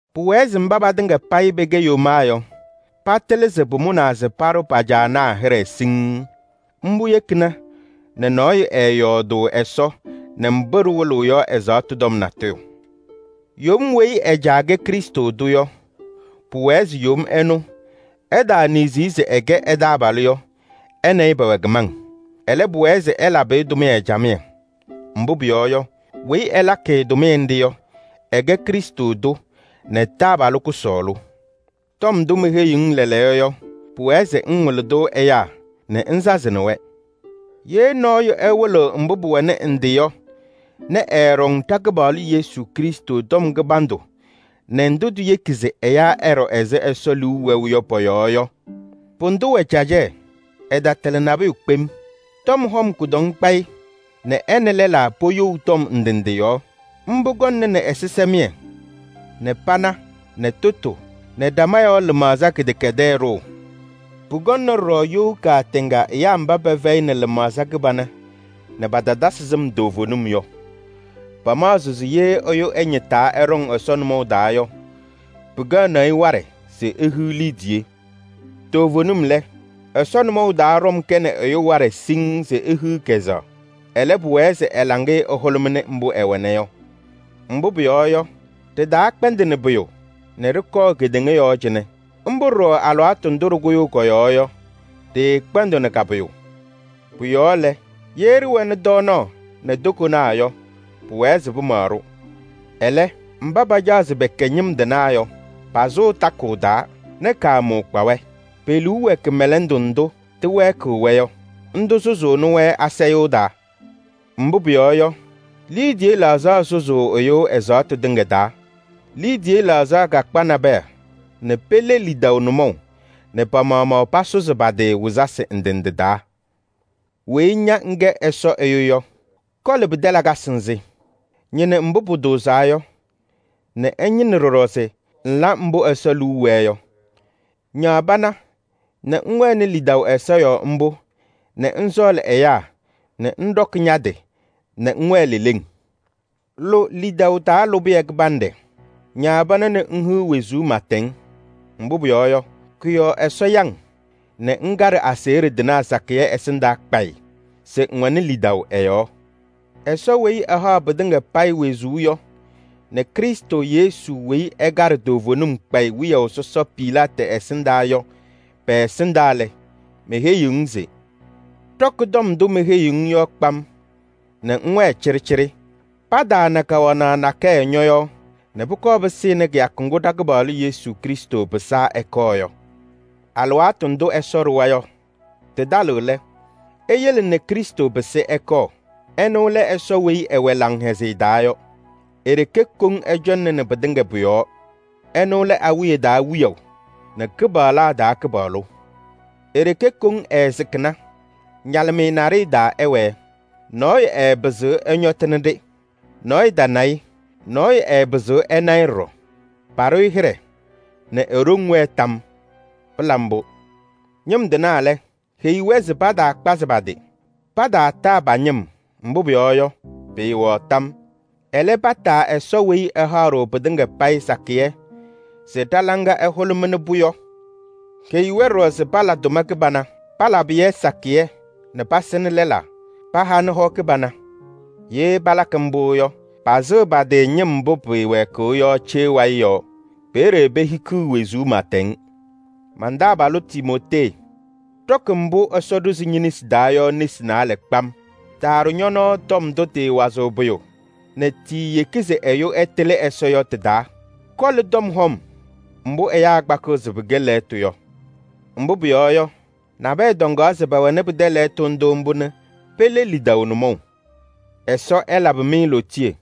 Pʋwɛɛ se mba patɩŋa payɩ pɛkɛ yomaa yɔ, patɩlɩ se pʋmʋnaa se paɖʋ pa-caanaa hɩɖɛ siŋŋ. Mbʋ yekina nɛ nɔɔyʋ ɛɛyɔɔdʋʋ Ɛsɔ nɛ mbʋ ɖɩwɩlɩɣ yɔ ɛzaɣtʋ tɔm natʋyʋ. Yom weyi ɛ-caa kɛ Krɩstʋ tʋ yɔ, pʋwɛɛ se yom ɛnʋ, ɛtaaniɣzi-i se ɛkɛ ɛ-taabalʋ yɔ, ɛ nɛ ɩ pɛwɛ kɩmaŋ. Ɛlɛ, pʋwɛɛ se ɛlabɩ-ɩ tʋmɩyɛ camɩyɛ. Mbʋ pʋyɔɔ yɔ, weyi ɛlakɩ-ɩ tʋmɩyɛ nɖɩ yɔ, ɛkɛ Krɩstʋ tʋ nɛ taabalʋ kʋsɔɔlʋ. Cɛtɩm tɔm wɩlɩyaa tɔm Tɔm ndʋ meheyi-ŋ lɛɛlɛɛyɔ yɔ, pʋwɛɛ se ŋwɩlɩ ɛyaa nɛ ŋsazɩnɩ-wɛ. Ye nɔɔyʋ ɛwɩlɩɣ mbʋ pʋwɛnɩ ndɩ yɔ nɛ ɛɛɖɔŋ ɖa-Kɩpaɣlʋ Yesu Krɩstʋ tɔm kɩbandʋ nɛ ndʋ tiyeki se ɛyaa ɛɖɔ ɛzɩ Ɛsɔ liu wɛʋ yɔ pɔ-yɔɔ yɔ, pʋdʋ wɛ cacɛyɛ. Ɛtatɩlɩ nabʋyʋ kpem. Tɔm hɔm kʋdɔŋ kpa-ɩ nɛ ɛ nɛ lɛlaa poyou tɔm ndɩ ndɩ yɔɔ. Mbʋ kɔŋnɩnɩ ɛzɩsɛmɩyɛ nɛ pana nɛ tʋtʋ nɛ ɖama yɔɔ lɩmaɣza kɩdɛkɛdɛɛ ɖʋʋ. Pʋkɔŋnɩ ɖɔɖɔ you kaatɛŋa ɛyaa mba pɛfɛyɩnɩ lɩmaɣza kɩbana nɛ patatasɩ sɩm toovenim yɔ. Pamaɣzɩɣ se ye ɛyʋ ɛñɩtaa ɛɖɔŋ Ɛsɔ nʋmɔʋ taa yɔ, pɩkɛɣnɩ-ɩ waɖɛ se ehiɣ liidiye. Toovenim lɛ, Ɛsɔ nʋmɔʋ taa ɖɔm kɛnɩ ɛyʋ waɖɛ siŋŋ se ehiɣ kɛzɛɣ. Ɛlɛ, pʋwɛɛ se ɛ-laŋɩyɛ ɛhʋlʋmɩnɩ mbʋ ɛwɛna yɔ. Mbʋ pʋyɔɔ yɔ, ɖɩtaakpɛndɩnɩ pʋyʋ nɛ ɖɩkɔɔ kedeŋa yɔɔ cɩnɛ. Mbʋ ɖɔɖɔ alɩwaatʋ ndʋ ɖɩkʋyʋʋ kɔ-yɔɔ yɔ, ɖɩɩkpɛndɩɣnɩ ka-pʋyʋ. Pʋ-yɔɔ lɛ, ye ɖɩwɛnɩ tɔɔnaɣ nɛ tokonaa yɔ, pʋwɛɛ se pɩmaɣ-ɖʋ. Ɛlɛ, mba pacaɣ se pɛkɛ ñɩm tɩnaa yɔ, pasʋʋ takʋʋ taa nɛ kaamʋʋ kpa-wɛ. Pe-liu wɛ kɩmɛlɛndʋ ndʋ tɩwɛɛkɩɣ-wɛ yɔ. Ndʋ sʋzʋʋnɩ-wɛ asayʋʋ taa. Mbʋ pʋyɔɔ yɔ, liidiye laɣzaɣ sʋzʋʋ ɛyʋ ɛzaɣtʋ tɩŋa taa. Liidiye laɣzaɣ kakpa nabɛyɛ nɛ pele lidaʋ nʋmɔʋ nɛ pa-maɣmaɣ pasʋzɩ pa-tɩ wɩzasɩ ndɩ ndɩ taa. Weyi ña ŋkɛ Ɛsɔ ɛyʋ yɔ, koli pɩtɛ lakasɩ nzɩ. Ñɩnɩ mbʋ pʋtʋʋzaa yɔ nɛ ŋñɩnɩ ɖɔɖɔ se ŋla mbʋ Ɛsɔ liu wɛɛ yɔ. Ñaɣ pana nɛ ŋwɛnɩ lidaʋ Ɛsɔ yɔɔ mbʋ nɛ ŋsɔɔlɩ ɛyaa nɛ ŋɖɔkɩ ña-tɩ nɛ ŋwɛɛ leleŋ. Lʋ lidaʋ taa lʋbɩyɛ kɩbanɖɛ. Ñaɣ pana nɛ ŋhiɣ wezuu pɩɩtɛŋ. Mbʋ pʋyɔɔ yɔ, kʋ-yɔɔ Ɛsɔ ya-ŋ nɛ ŋkaɖɩ aseɣɖe tɩnaa sakɩyɛ ɛsɩndaa kpayɩ se ŋwɛnɩ lidaʋ ɛ-yɔɔ. Ɛsɔ weyi ɛhaɣ pɩtɩŋa payɩ wezuu yɔ nɛ Krɩstʋ Yesu weyi ɛkaɖɩ toovenim kpayɩ wiyaʋ sɔsɔ Pilaatɩ ɛsɩndaa yɔ pɛ-ɛsɩndaa lɛ, meheyiɣ-ŋ se: ɖɔkɩ tɔm ndʋ meheyi-ŋ yɔ kpam nɛ ŋwɛɛ cɩɖɩcɩɖɩ. Pataana kawanaɣ nakɛyɛ ñɔ-yɔɔ nɛ pʋkɔɔ pɩsɩnɩ kɩyakʋ ŋgʋ ɖa-Kɩpaɣlʋ Yesu Krɩstʋ pɩsaa ɛkɔɔ yɔ. Alɩwaatʋ ndʋ Ɛsɔ ɖʋwa yɔ tɩtalɩɣ lɛ, eyele nɛ Krɩstʋ pɩsɩ ɛkɔɔ. Ɛnʋ lɛ Ɛsɔ weyi ɛwɛ laŋhɛzɩyɛ taa yɔ. E-ɖeke koŋ ɛcɔŋnɩnɩ pɩtɩŋa pʋ-yɔɔ. Ɛnʋ lɛ awiya taa Wiyaʋ nɛ kɩpaɣlaa taa Kɩpaɣlʋ. E-ɖeke koŋ ɛɛsɩkɩna, ñalɩmɩyɛ naɖɩyɛ taa ɛwɛɛ. Nɔɔyʋ ɛɛpɩzɩɣ ɛñɔtɩnɩ-ɖɩ. Nɔɔyʋ tana-ɩ, nɔɔyʋ ɛɛpɩzɩɣ ɛna-ɩ ɖɔɖɔ. Paɖʋ-ɩ hɩɖɛ nɛ e-ɖoŋ wɛɛ tam yɔɔ! Pɩla mbʋ. Ñɩm tɩnaa lɛ, heyi-wɛ se pataakpazɩ pa-tɩ. Pataataa pa-ñɩm, mbʋ pʋyɔɔ yɔ, pɩɩwɛɣ tam. Ɛlɛ, pataa Ɛsɔ weyi ɛhaɣ-ɖʋ pɩtɩŋa payɩ sakɩyɛ se ɖa-laŋa ɛhʋlʋmɩnɩ-pʋ yɔ. Heyi-wɛ ɖɔɖɔ se pala tʋma kɩbana. Palabɩ-yɛ sakɩyɛ nɛ pasɩnɩ lɛlaa, pahanɩ hɔ kɩbana. Ye palakɩ mbʋ yɔ, pasɩɣ pa-tɩ ñɩm mbʋ pɩɩwɛɛkɩɣ yɔ cee wayɩ yɔɔ. Peeye pehikiɣ wezuu pɩɩtɛŋ. Man-taabalʋ Timootee, ɖɔkɩ mbʋ Ɛsɔ ɖʋzɩ ñe-nesi taa yɔ nesi naalɛ kpam. Taaɖʋ ñɔ-nɔɔ tɔm ndʋ tɩɩwazɩɣ pʋyʋ nɛ tiiyeki se ɛyʋ ɛtɩlɩ Ɛsɔ yɔ tɩ-taa. Koli tɔm hɔm mbʋ ɛyaa kpakɩɣ se pɩkɛ lɛɣtʋ yɔ. Mbʋ pʋyɔɔ yɔ, nabɛyɛ tɔŋaɣ se pɛwɛnɩ pɩtɛ lɛɣtʋ ndʋ mbʋ nɛ pele lidaʋ nʋmɔʋ. Ɛsɔ ɛlabɩ-mɩ lootiye.